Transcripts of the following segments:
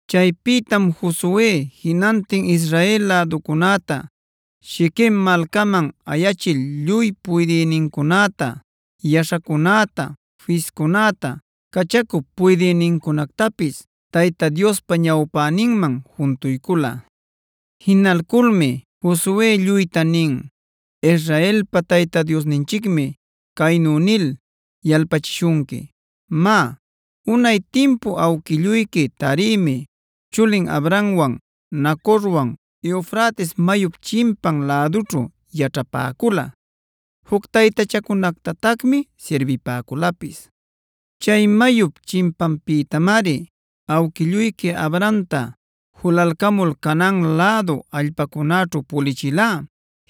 Chaypïtam Josue jinantin Israel läducunäta Shiquem malcaman ayachil lluy puydïnincunäta, yaśhacunäta, fiscunäta, cachacup puydïnincunactapis Tayta Diospa ñawpäninman juntuycula. Jinalculmi Josue lluyta nin: “Israelpa Tayta Diosninchicmi caynu nil yalpachishunqui: ‘Má, unay timpu awquilluyqui Taremia chulin Abrahamwan, Nacorwan Eufrates mayup chimpan lädućhu yaćhapäcula. Juc taytachacunactatacmi sirbipäculapis. Chay mayup chimpanpïtamari awquilluyqui Abrahamta julalcamul Canaan lädu allpacunäćhu pulichilá.b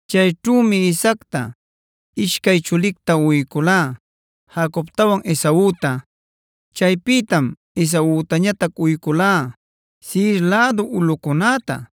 Chayćhümi Isaacta ishcay chulicta uyculá: Jacobtawan Esauta.d Chaypïtam Esautañatac uyculá Seire lädu ulꞌucunäta.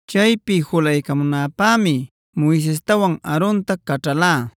Chaypi julaycamunäpämi Moisestawan Aaronta caćhalá;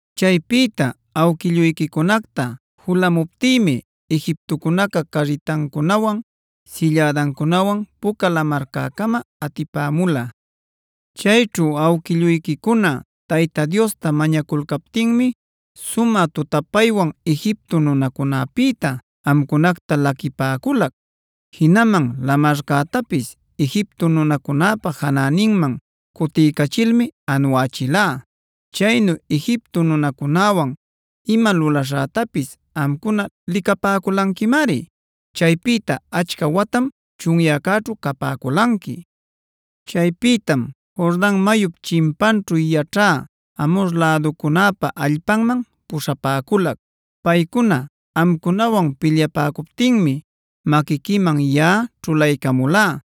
Chaypïta awquilluyquicunacta julamuptïmi Egiptocunaca carritancunawan, sillädancunawan Puca Lamarcäcama atipämula. Chayćhu awquilluyquicuna Tayta Diosta mañaculcaptinmi sumä tutapaywan Egipto nunacunäpïta amcunacta laquipäculac. Jinaman lamarcätapis Egiptocunäpa janäninman cutiycachilmi anuächilá. Chaynu Egipto nunacunäwan ima lulaśhätapis amcuna licapäculanquimari. “ ‘Chaypïta achca watam chunyäcäćhu capäculanqui. Chaypïtam Jordan mayup chimpanćhu yaćhä Amhor läducunäpa allpanman puśhapäculac. Paycuna amcunawan pilyapäcuptinmi maquiquiman yaꞌa ćhulaycamulá.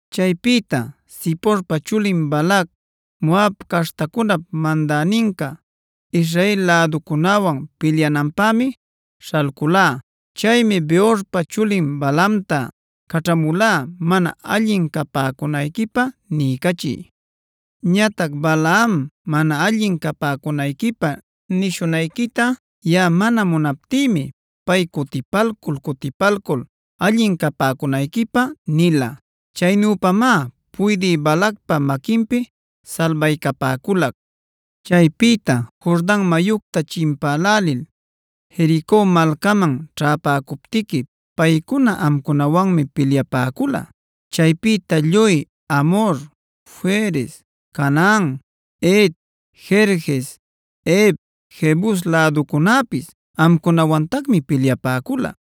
Chaypïta Ziporpa chulin Balac, Moab caśhtacunap mandäninca Israel läducunäwan pilyananpämi śhalcüla. Chaymi Beorpa chulin Balaamta caćhamula mana allin capäcunayquipä niycachï. Ñatac Balaam mana allin capäcunayquipä nishunayquita yaꞌa mana munaptïmi pay cutipalcul-cutipalcul allin capäcunayquipä nila.i Chaynüpamá puydï Balacpa maquinpi salbaycapäculac. “ ‘Chaypïta Jordanj mayucta chimpälälil Jerico malcaman ćhäpäcuptiqui paycuna amcunawanmi pilyapäcula. Chaypïta lluy Amhor, Ferez, Canaan, Het, Gerges, Hev, Jebus läducunäpis amcunawantacmi pilyapäcula.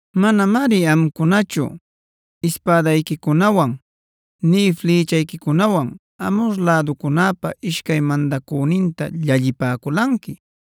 Manamari amcunachu ispädayquicunawan nï flïchayquicunawan Amhor läducunäpa ishcay mandacüninta llallipäculanqui;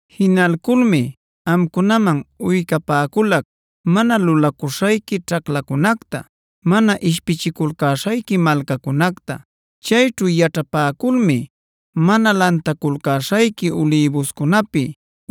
“ ‘Jinalculmi amcunaman uycapäculac mana lulaculcäśhayqui ćhaclacunacta, mana ishpichiculcäśhayqui malcacunacta. Chayćhu yaćhapäculmi mana lantaculcäśhayqui ulïbuscunapi,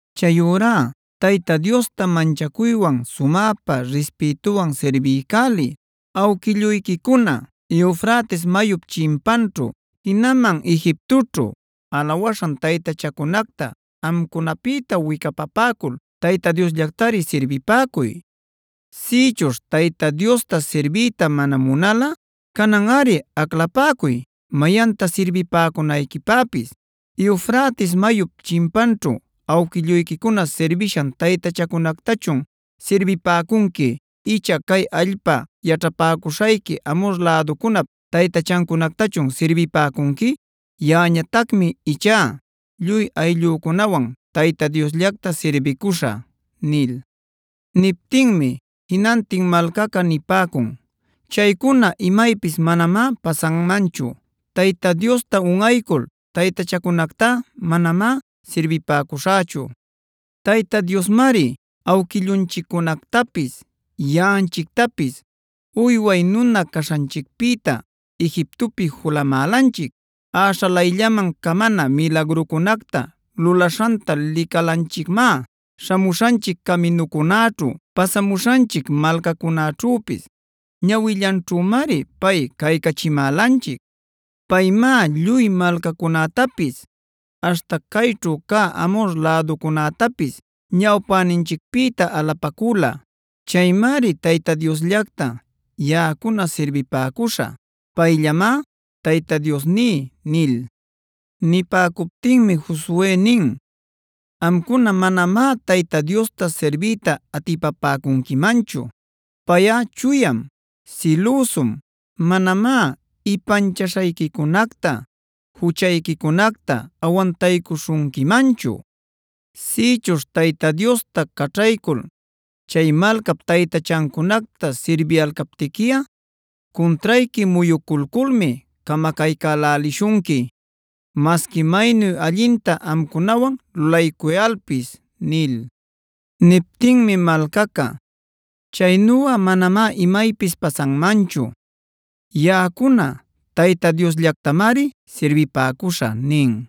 “Chayurá Tayta Diosta manchacuywan sumäpa rispïtuwan sirbiycäliy. Awquilluyquicuna Eufrates mayup chimpanćhu, jinaman Egiptoćhu alawaśhan taytachacunacta amcunapïta wicapapäcul Tayta Diosllactari sirbipäcuy. Sïchuśh Tayta Diosta sirbiyta mana munalꞌa cananꞌari aclapäcuy mayanta sirbipäcunayquipäpis. ¿Eufrates mayup chimpanćhu awquilluyquicuna sirbishan taytachacunactachun sirbipäcunqui icha cay allpa yaćhapäcuśhayqui Amhor läducunap taytachancunactachun sirbipäcunqui? Yaꞌañatacmi ichá lluy ayllücunawan Tayta Diosllacta sirbicuśhä” nil. Niptinmi jinantin malcaca nipäcun: “Chaycuna imaypis manamá pasanmanchu. Tayta Diosta unꞌaycul taytachacunactá manamá sirbipäcuśhächu. Tayta Diosmari awquillunchiccunactapis, yaꞌanchictapis uyway nuna caśhanchicpïta Egiptopi julamälanchic. Äśhalayllaman camana milagrucunacta lulaśhanta licalanchicmá. Śhamuśhanchic caminucunäćhu, pasamuśhanchic malcacunäćhüpis ñawillanćhümari pay caycachimälanchic. Paymá lluy malcacunätapis aśhta cayćhu cä Amhor läducunätapis ñawpäninchicpïta alapacüla. Chaymari Tayta Diosllacta yaꞌacuna sirbipäcuśhä. Payllamá Tayta Diosní” nil. Nipäcuptinmi Josue nin: “Amcuna manamá Tayta Diosta sirbiyta atipapäcunquimanchu. Payꞌa chuyam, silüsum. Manamá ipanchaśhayquicunacta, juchayquicunacta awantaycuśhunquimanchu. Sïchuśh Tayta Diosta caćhaycul chay malcap taytachancunacta sirbiyalcaptiquiꞌa cuntrayqui muyuculculmi camacaycälälishunqui, masqui maynu allinta amcunawan lulaycuyalpis” nil. Niptinmi malcaca: “Chaynuꞌa manamá imaypis pasanmanchu. Yaꞌacuna Tayta Diosllactamari sirbipäcuśhä” nin.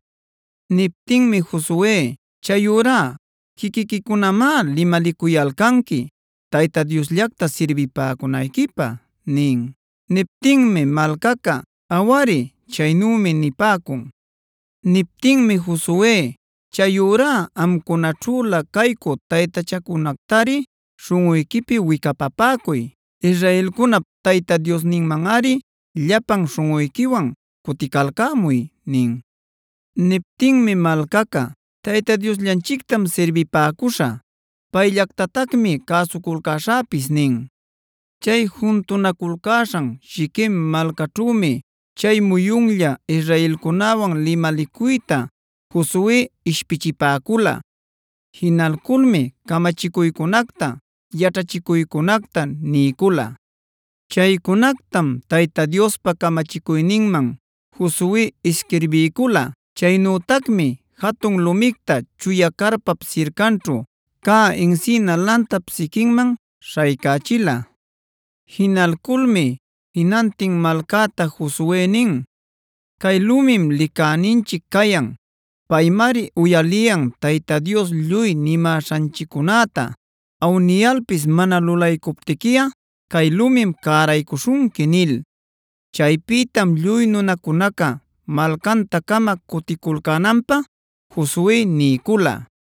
Niptinmi Josue: “Chayurá quiquiquicunamá limalicuyalcanqui Tayta Diosllacta sirbipäcunayquipä” nin. Niptinmi malcaca: “Awari, chaynümi” nipäcun. Niptinmi Josue: “Chayurá amcunaćhülä caycü taytachacunactari śhunꞌuyquipi wicapapäcuy. Israelcunap Tayta Diosninmanꞌari llapan śhunꞌuyquiwan cuticalcämuy” nin. Niptinmi malcaca: “Tayta Diosllanchictam sirbipäcuśhä; payllactatacmi cäsuculcäśhäpis” nin. Chay juntunaculcäśhan Shiquem malcaćhümi chay muyunlla israelcunäwan limalicuyta Josue ishpichipäcula. Jinalculmi camachicuycunacta, yaćhachicuycunacta niycula. Chaycunactam Tayta Diospa camachicuyninman Josue isquirbiycula. Chaynütacmi jatun lumicta chuya carpap sircanćhu cä encina lantap siquinman śhaycächila. Jinalculmi jinantin malcäta Josue nin: “Cay lumim licäninchic cayan. Paymari uyaliyan Tayta Dios lluy nimäśhanchiccunäta. Awniyalpis mana lulaycuptiquiꞌa cay lumim cäraycuśhunqui” nil. Chaypïtam lluy nunacunaca malcanta-cama cuticulcänanpä Josue niycula.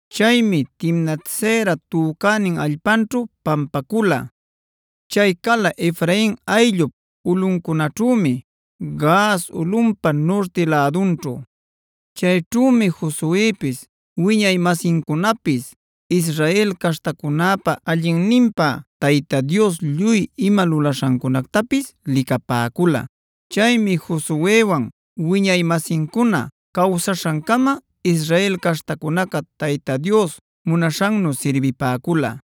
Chaymi Timnat-seran tücänin allpanćhu pampacula. Chay cala Efrain ayllup ulꞌuncunaćhümi, Gaas ulꞌunpa nurti lädunćhu. Chayćhümi Josuepis wiñay-masincunapis Israel caśhtacunäpa allinninpä Tayta Dios lluy ima lulaśhancunactapis licapäcula. Chaymi Josuewan wiñay-masincuna cawsaśhancama Israel caśhtacunaca Tayta Dios munaśhannu sirbipäcula.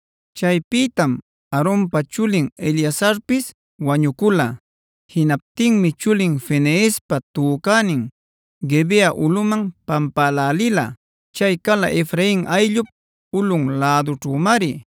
Chaypïtam Aaronpa chulin Eleazarpis wañucula. Jinaptinmi chulin Fineespa tücänin Guibea ulꞌuman pampälälila; chay cala Efrain ayllup ulꞌun lädućhümari.